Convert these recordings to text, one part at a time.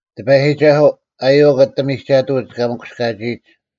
ᑎᐸᔨᒋᒐᓱᐤ, ᐊᔪᐛᒃ ᐊᑎ ᒥᒐᑐᐅᒡ ᑲ ᒥᑯᔅᑲᒋᐃᒡ!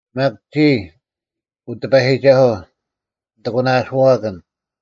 ᒪᒃ ᒋᔾ, ᐅ ᑎᐸᔨᒋᒐᓱᐤ, ᓂᑦ ᐊᒂᓇᐅᓱᐛᑭᓐ;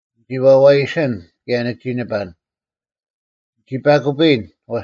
ᓂᒋ ᐛᐛᔨᓯᓐ ᑭᔭ ᓂᒋ ᓂᐸᓐ; ᓂᒋ ᐸᑯᐱᔨᓐ;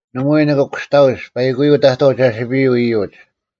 ᓇᒪᐎᔾ ᓂᑭ ᑯᔅᑕᐅᒡ ᐸᐃᑯᔪᐤ ᑕᑥᐤ ᒐᓯᐱᔪᐤ ᐃᔪᒡ,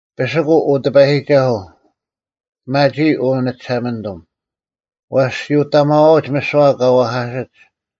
ᐱᓯᑯᐤ, ᐅ ᑎᐸᔨᒋᒐᓱᐤ; ᐱᒪᒋᐃ, ᐅ ᓂᒋᓴᒪᓂᑐᒻ; ᐛᔅ ᔅᒋ ᐅᑕᒪᐛᐅᒡ ᒥᓯᐛ ᑲ ᐛᐧᑲᓯᒡ;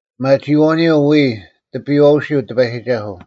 ᐱᒪᒋᐃᐛᐅᓂᔪᐤ ᐎᔾ ᑎᐱᔨᐛᐅᓯᐤ ᑎᐸᔨᒋᒐᓱᐤ: